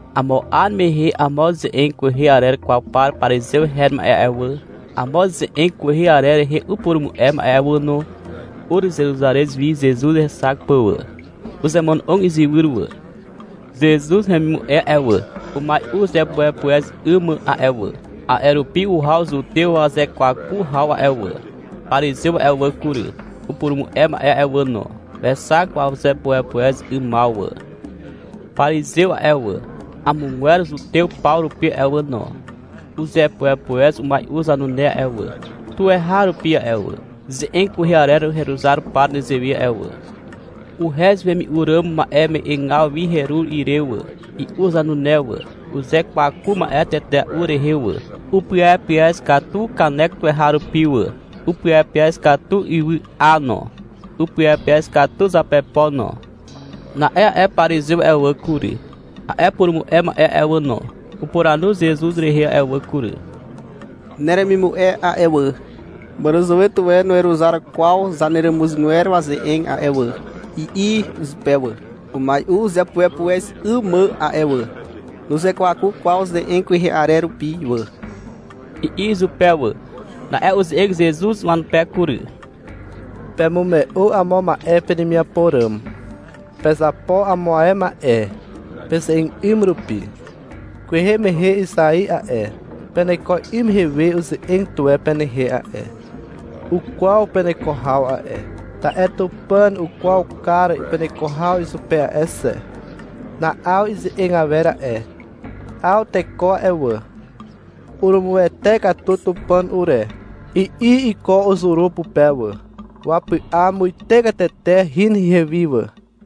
Amo 'ar mehe amo ze'eg kwehe arer kwaw par parizew her ma'e a'e wà, amo ze'eg kwehe arer rehe upurumu'e ma'e a'e wà no, ur Zeruzarez wi Zezuz hexak pà wà. Uzemono'og izywyr wà. Zezuz hemimu'e a'e wà, umai'u uzepuepuez 'ym mà a'e wà. A'e rupi uhaw Zutew wazekwaku haw a'e wà. Parizew a'e wà kury, upurumu'e ma'e a'e wà no, wexak wazepuepuez 'ymaw wà. Parizew a'e wà, amogwer zutew paw rupi a'e wà no, uzepuepuez umai'u zanune a'e wà, tuweharupi a'e wà, ze'eg kwehe arer heruzar pà nezewe a'e wà. Uhez wemi'u ràm ma'eme'egaw wi herur ire wà, i'u zanune wà. Uzekwaku ma'e tetea'u rehe wà. Upyepyez katu kanek tuweharupi wà, upyepyez katu ywy'a no, upyepyez katu zapepo no. Na'e a'e parizew a'e wà kury, a'e purumu'e ma'e a'e wà no, upuranu Zezuz rehe a'e wà kury. — Neremimu'e a'e wà, màràzàwe tuwe nuweruzar kwaw zaneràmuzgwer waze'eg a'e wà, i'i izupe wà. — Umai'u uzepuepuez 'ym mà a'e wà. Nuzekwaku kwaw ze'eg kwehe arer rupi wà, i'i izupe wà. Na'e uze'eg Zezuz wanupe kury. — Pemume'u amo ma'e penemiapo ràm. Pezapo amo ae ma'e, peze'eg 'ym rupi. — Kwehe mehe Izai a'e, peneko 'ym mehe uze'eg tuwe penehe a'e. Ukwaw peneko haw a'e. Ta'e Tupàn ukwaw kar peneko haw izupe a'e xe. Na'aw ize'eg awer a'e. 'Aw teko a'e wà, urumuwete katu Tupàn ure, i'i iko uzuru pupe wà, wapy'a muite katete hin ihewi wà.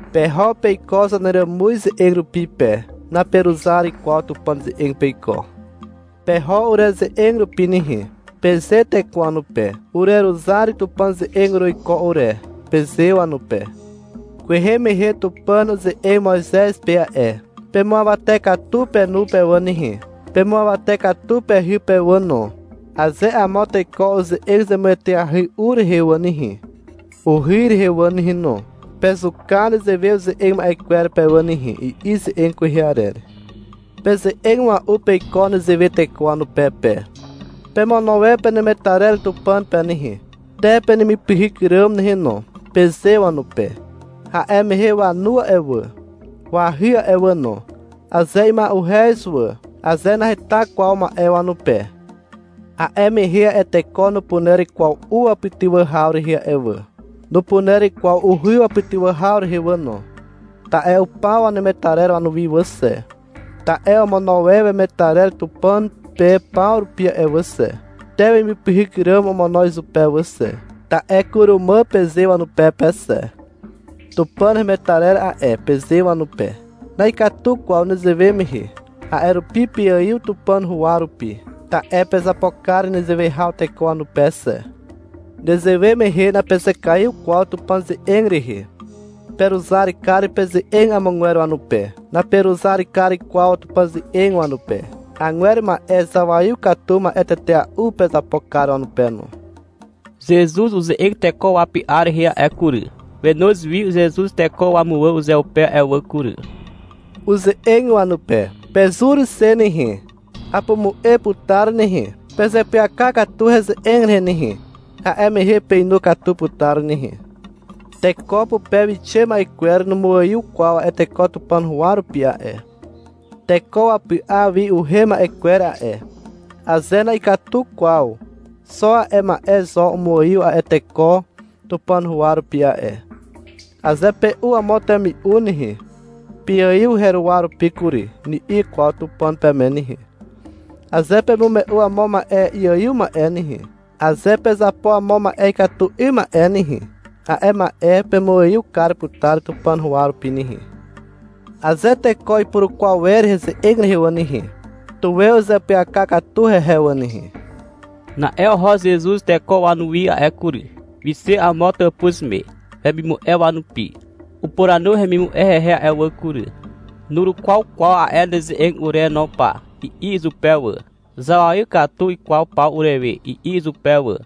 Peho peiko zaneràmuz ze'eg rupi pe, naperuzar kwaw Tupàn ze'eg peiko. — Peho ureze'eg rupi nehe, peze teko wanupe. — Ureruzar Tupàn ze'eg uruiko ure, peze wanupe. Kwehe mehe Tupàn uze'eg Moizez pe a'e. — Pemuawate katu penu pe wà nehe, pemuawate katu pehy pe wà no, aze amo teko uze'eg zemueteahy u rehe wà nehe, uhy rehe wà nehe no, pezuka nezewe uze'eg ma'e kwer pe wà nehe, i'i ze'eg kwehe arer. Peze'eg mua'u peiko nezewe teko wanupe pe. — Pemono e penemetarer Tupàn pe nehe, Te penemipyhyk ràm nehe no, peze wanupe. A'e mehe wanu a'e wà, wahy a'e wà no, aze ima'uhez wà, aze naheta kwaw ma'e wanupe, a'e mehe a'e teko nupuner kwaw u wapytywà haw rehe a'e wà. Nupuner kwaw uhy wapytywà haw rehe wà no, ta'e upaw wanemetarer wanuwi wà xe. Ta'e omono e wemetarer Tupàn pe paw rupi a'e wà xe, Te wemipyhyk ràm omono izupe wà xe. Ta'e — Kurumà, peze wanupe pe xe. — Tupàn hemetarer a'e, peze wanupe. Na'ikatu kwaw nezewe mehe. A'e rupi peaiw Tupàn huwa rupi, ta'e pezapo kar nezewe haw teko wanupe xe. Nezewe mehe napezekaiw kwaw Tupàn ze'eg rehe. Peruzar kar peze'eg amogwer wanupe. Naperuzar kar kwaw Tupàn ze'eg wanupe. Agwer ma'e zawaiw katu ma'e tetea'u pezapo kar wanupe no. Zezuz uze'eg teko wapy'a rehe a'e kury. Wenoz wi Zezuz teko wamuwà uzeupe a'e wà kury. Uze'eg wanupe. — Pezur xe nehe, apumu'e putar nehe. Pezeapyaka katu heze'eg rehe nehe. A'e mehe peinu katu putar nehe. Teko pupe wixe ma'e kwer numuaiw kwaw a'e teko Tupàn huwa rupi a'e. Teko wapy'a wi uhem ma'e kwer a'e, aze na'ikatu kwaw, xo a'e ma'e zo umuaiw a'e teko Tupàn huwa rupi a'e. (Aze pe'u amo temi'u nehe, — Peaiw heruwa rupi kury, ni'i kwaw Tupàn peme nehe. Aze pemume'u amo ma'e iaiw ma'e nehe, aze pezapo amo ma'e ikatu 'ym ma'e nehe, a'e ma'e pemuaiw kar putar Tupàn huwa rupi nehe.) Aze teko ipurukwaw wer heze'eg rehe wà nehe, tuwe uzeapyaka katu hehe wà nehe. Na'e oho Zezuz teko wanuwi a'e kury. Wixe amo tàpuz me, wemimu'e wanupi. Upuranu hemimu'e hehe a'e wà kury. — Nurukwaw kwaw a'e neze'eg ure no pa, i'i izupe wà. — Zawaiw katu ikwaw paw urewe, i'i izupe wà.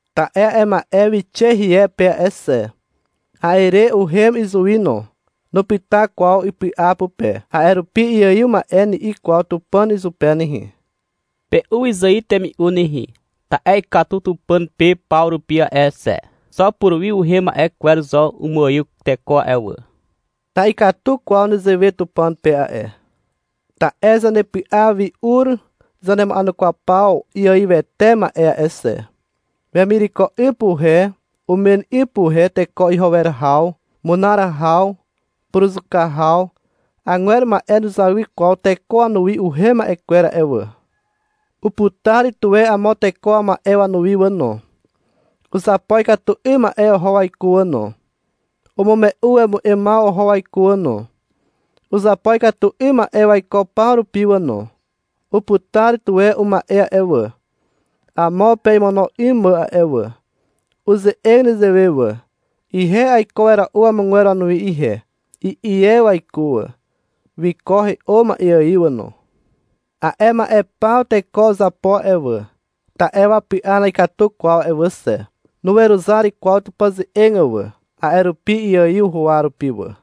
Ta'e a'e ma'e wixe hie pe a'e xe. A'e re, uhem izuwi no. Nupyta kwaw ipy'a pupe, a'e rupi — Iaiw ma'e, ni'i kwaw Tupàn izupe nehe. Pe'u wyzài temi'u nehe, ta'e ikatu Tupàn pe paw rupi a'e xe. Xo puruwi uhem ma'e kwer zo umuaiw teko a'e wà. Na'ikatu kwaw nezewe Tupàn pe a'e. Ta'e zanepy'a wi ur zanema'enukwaw paw iaiwete ma'e a'e xe. Wemireko 'ym puhe umen 'ym puhe teko iho haw, munar haw, puruzuka haw. (Agwer ma'e nuzawy kwaw teko wanuwi uhem ma'e kwer a'e wà.) Uputar tuwe amo teko wama'e wanuwi wà no. Uzapo ikatu 'ym ma'e oho waiko wà no. Umume'u wemu'emaw oho waiko wà no. Uzapo ikatu 'ym ma'e waiko paw rupi wà no. Uputar tuwe uma'e a'e wà, amo pe imono 'ym mà a'e wà. Uze'eg nezewe wà, — Ihe aiko wera'u amogwer wanuwi ihe, i'i e waiko wà. Wiko he'o ma'e ài wà no. A'e ma'e paw teko uzapo a'e wà, ta'e wapy'a na'ikatu kwaw a'e wà xe. Nuweruzar kwaw Tupàn ze'eg wà, a'e rupi iaiw huwa rupi wà.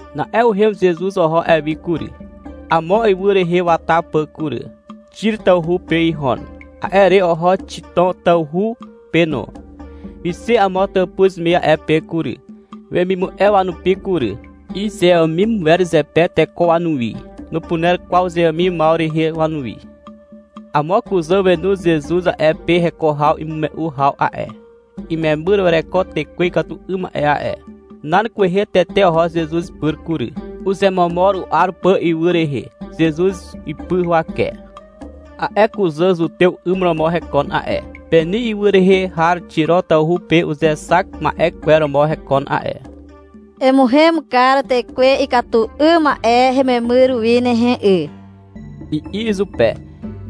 Na'e uhem Zezuz oho a'e wi kury, amo ywy rehe wata pà kury. Xir tawhu pe ihon. A'e re oho Xitom tawhu pe no. Wixe amo tàpuz me a'e pe kury, wemimu'e wanupi kury. Izeàmim wer zepe teko wanuwi. Nupuner kwaw uzeàmimaw rehe wanuwi. Amo kuzà wenu Zezuz a'e pe heko haw imume'u haw a'e. Imemyr wereko tekwe ikatu 'ym ma'e a'e. Nan kwehe tete oho Zezuz ipyr kury. Uzemomor u'ar pà ywy rehe, Zezuz ipy huwake. A'e kuzà Zutew 'ym romo hekon a'e. Peni ywy rehe har Xiro tawhu pe uzexak ma'e kwer romo hekon a'e. — Emuhem kar tekwe ikatu 'ym ma'e hememyr wi nehe 'y, i'i izupe,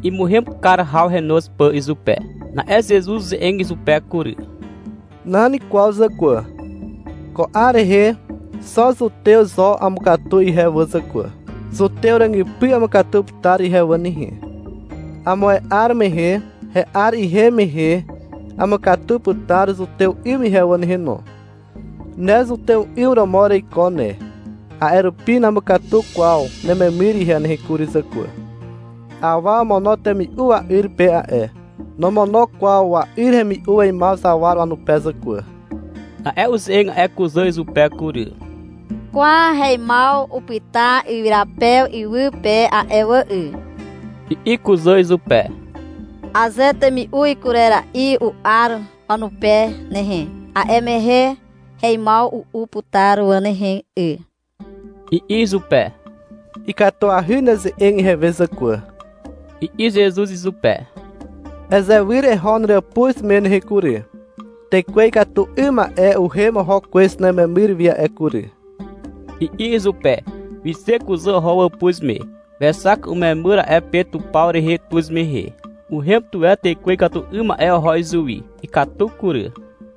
imuhem kar haw henoz pà izupe. Na'e Zezuz uze'eg izupe kury. — Nan kwaw zàkwà. Ko 'ar rehe xo zutew zo amukatu ihe wà zàkwà. Zutew ràgypy amukatu putar ihe wà nehe. Amo ae 'ar mehe he'ar ihem mehe amukatu putar zutew 'ym ihe wà nehe no. Ne zutew 'ym romo ereiko ne, a'e rupi namukatu kwaw nememyr ihe nehe kury zàkwà. Awa omono temi'u wa'yr pe a'e. Nomono kwaw wa'yr hemi'u weimaw zawar wanupe zàkwà. Na'e uze'eg a'e kuzà izupe kury. — Kwa, heimaw upyta ywyrapew iwy pe a'e wà 'y, i'i kuzà izupe. — Aze temi'u ikurera'i u'ar wanupe nehe, a'e mehe heimaw u'u putar wà nehe 'y, i'i izupe. — Ikatuahy neze'eg ihewe zàkwà, i'i Zezuz izupe. — Ezewyr eho neràpuz me nehe kury. Tekwe ikatu 'ym ma'e uhem oho kwez nememyr wi a'e kury, i'i izupe. Wixe kuzà oho wàpuz me. Wexak umemyr a'e pe tupaw rehe tuz mehe. Uhem tuwe tekwe ikatu 'ym ma'e oho izuwi. Ikatu kury.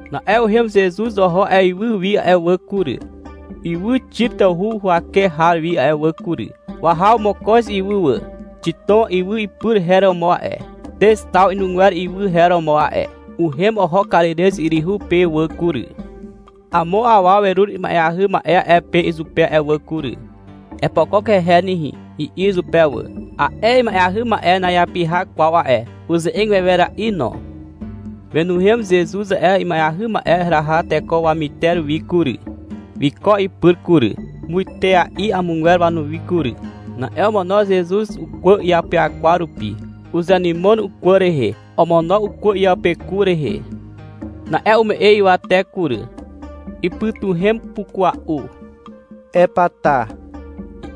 Na'e uhem Zezuz oho a'e ywy wi a'e wà kury, ywy Xir tawhu huwake har wi a'e wà kury. Wahaw mokoz ywy wà. Xitom, ywy ipy her romo a'e. Teztaw inugwer ywy her romo a'e. Uhem oho Karirez yryhu pe wà kury. Amo awa werur ima'eahy ma'e a'e pe izupe a'e wà kury. — Epokok hehe nehe, i'i izupe wà. A'e ima'eahy ma'e na'iapyha kwaw a'e. Uze'eg wewera'i no. Wenuhem Zezuz a'e ima'eahy ma'e heraha teko wamyter wi kury. Wiko ipyr kury, muitea'i amogwer wanuwi kury. Na'e omono Zezuz ukwà iapyakwar rupi. Uzenymon ukwà rehe. Omono ukwà iapeku rehe. Na'e ume'e ywate kury. Ipytuhem pukua'u. — Epata,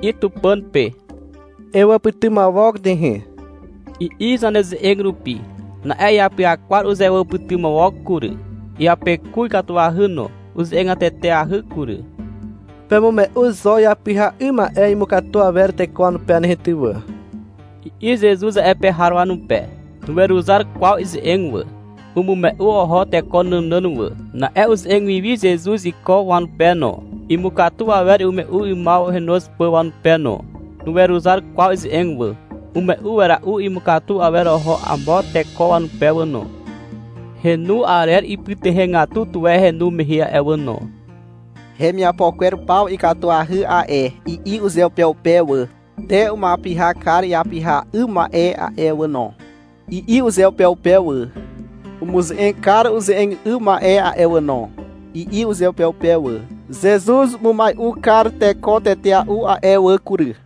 i'i Tupàn pe. — Ewàpytymawok nehe, i'i zaneze'eg rupi. Na'e iapyakwar uzewàpytymawok kury. Iapeku ikatuahy no. Uze'egateteahy kury. — Pemume'u zo iapyha 'ym ma'e imukatu awer teko wanupe nehe ty wà, i'i Zezuz a'e pe har wanupe. Nuweruzar kwaw ize'eg wà. Umume'u oho teko nànàn wà. Na'e uze'eg wi Zezuz iko wanupe no, imukatu awer imume'u 'ymaw henoz pà wanupe no. Nuweruzar kwaw ize'eg wà. Umume'u wera'u imukatu awer oho amo teko wanupe wà no. Henu arer ipytuhegatu tuwe henu mehe a'e wà no. — Hemiapo kwer paw ikatuahy a'e, i'i uzeupeupe wà. — Te umuapyha kar iapyha 'ym ma'e a'e wà no, i'i uzeupeupe wà. — Umuze'eg kar uze'eg 'ym ma'e a'e wà no, i'i uzeupeupe wà. Zezuz umumai'u kar teko tetea'u a'e wà kury.